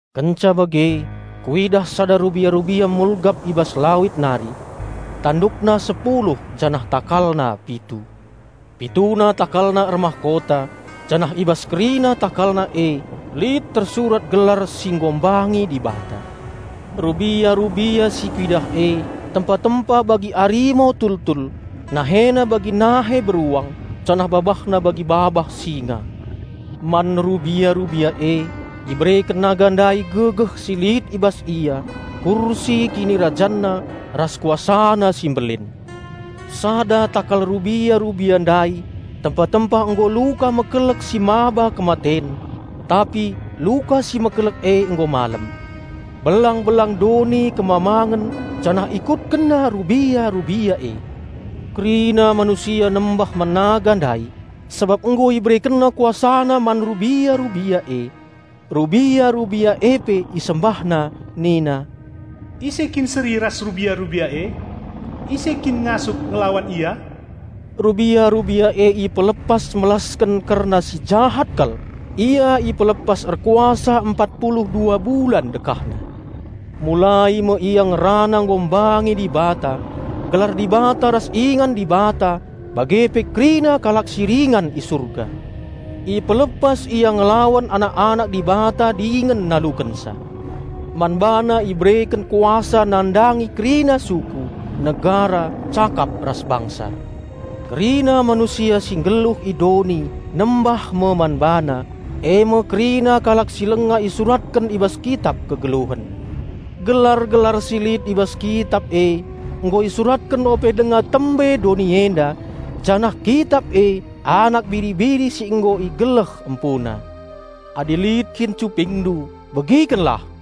Kenca bage kuidah sada rubia-rubia mulgap i bas lawit nari. Tandukna sepuluh janah takalna pitu. Pituna takalna ermahkota, janah i bas kerina takalna e lit tersurat gelar si enghina Dibata. Rubia-rubia si kuidah e tempa-tempa bagi arimo tultul, nahena bagi nahe beruang, janah babahna bagi babah singa. Man rubia-rubia e ibereken naga ndai gegeh si lit i bas ia, kursi kinirajanna, ras kuasana si mbelin. Sada takal rubia-rubia ndai tempa-tempa nggo luka mekelek si maba kematen, tapi luka si mekelek e nggo malem. Belang-belang doni kemamangen janah ikutkenna rubia-rubia e. Kerina manusia nembah man naga ndai sabap nggo iberekenna kuasana man rubia-rubia e. Rubia-rubia e pe isembahna nina, "Ise kin seri ras rubia-rubia e? Ise kin ngasup ngelawan ia?" Rubia-rubia e ipelepas melasken kerna si jahat kal, ia ipelepas erkuasa empat pulu dua bulan dekahna. Mulai me ia ngerana enghina Dibata, gelar Dibata ras ingan Dibata bage pe kerina kalak si ringan i Surga. Ipelepas ia ngelawan anak-anak Dibata dingen nalukenca. Man bana ibereken kuasa nandangi kerina suku, negara, cakap ras bangsa. Kerina manusia si nggeluh i doni nembah me man bana: e me kerina kalak si langa isuratken i bas Kitap Kegeluhen. Gelar-gelar si lit i bas Kitap e nggo isuratken ope denga tembe doni enda, janah Kitap e Anak Biri-biri si nggo igeleh empuna. Adi lit kin cupingndu begikenlah!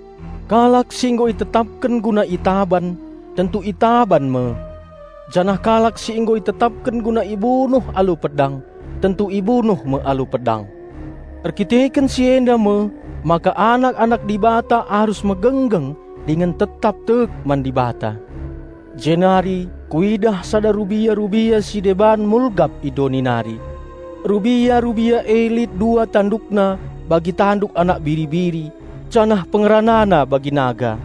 Kalak si nggo itetapken guna itaban, tentu itaban me. Janah kalak si nggo itetapken guna ibunuh alu pedang, tentu ibunuh me alu pedang. Erdandanken si enda me maka anak-anak Dibata arus megenggeng dingen tetap tek man Dibata. Jenari kuidah sada rubia-rubia si deban mulgap i doni nari. Rubia-rubia e lit dua tandukna bagi tanduk anak biri-biri, janah pengeranana bagi naga.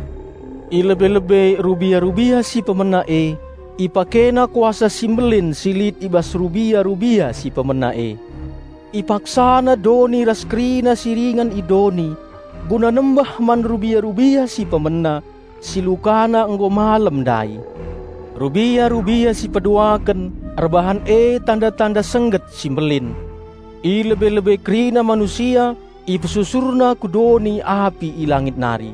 I lebe-lebe rubia-rubia si pemena e ipakena kuasa si mbelin si lit i bas rubia-rubia si pemena e. Ipaksana doni ras kerina si ringan i doni guna nembah man rubia-rubia si pemena, si lukana nggo malem ndai. Rubia-rubia si peduaken erbahan e tanda-tanda sengget si mbelin. I lebe-lebe kerina manusia ipesusurna ku doni api i langit nari.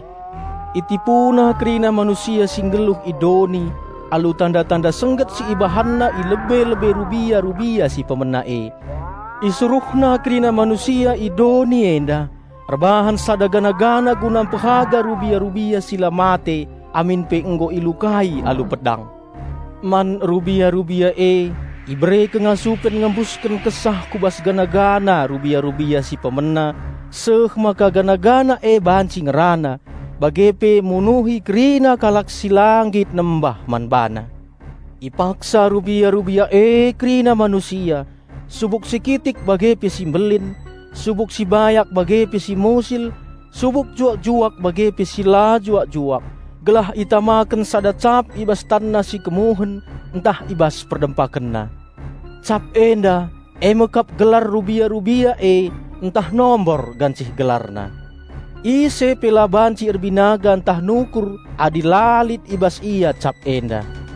Itipuna kerina manusia si nggeluh i doni alu tanda-tanda sengget si ipelepas ibahanna i lebe-lebe rubia-rubia si pemena e. Isuruhna kerina manusia i doni enda erbahan sada gana-gana mpehaga rubia-rubia si la mate amin pe nggo ilukai alu pedang. Man rubia-rubia e ibere kengasupen ngembusken kesah ku bas gana-gana rubia-rubia si pemena, seh maka gana-gana e banci ngerana, bage pe munuhi kerina kalak si la nggit nembah man bana. Ipaksaken rubia-rubia e kerina manusia, subuk si kitik bage pe si mbelin, subuk si bayak bage pe si musil, subuk juak-juak bage pe si la juak-juak, gelah itamaken sada cap i bas tanna si kemuhen ntah i bas perdempakenna. Cap enda e me kap gelar rubia-rubia e ntah nomor gancih gelarna. Ise pe la banci erbinaga ntah nukur adi la lit i bas ia cap enda.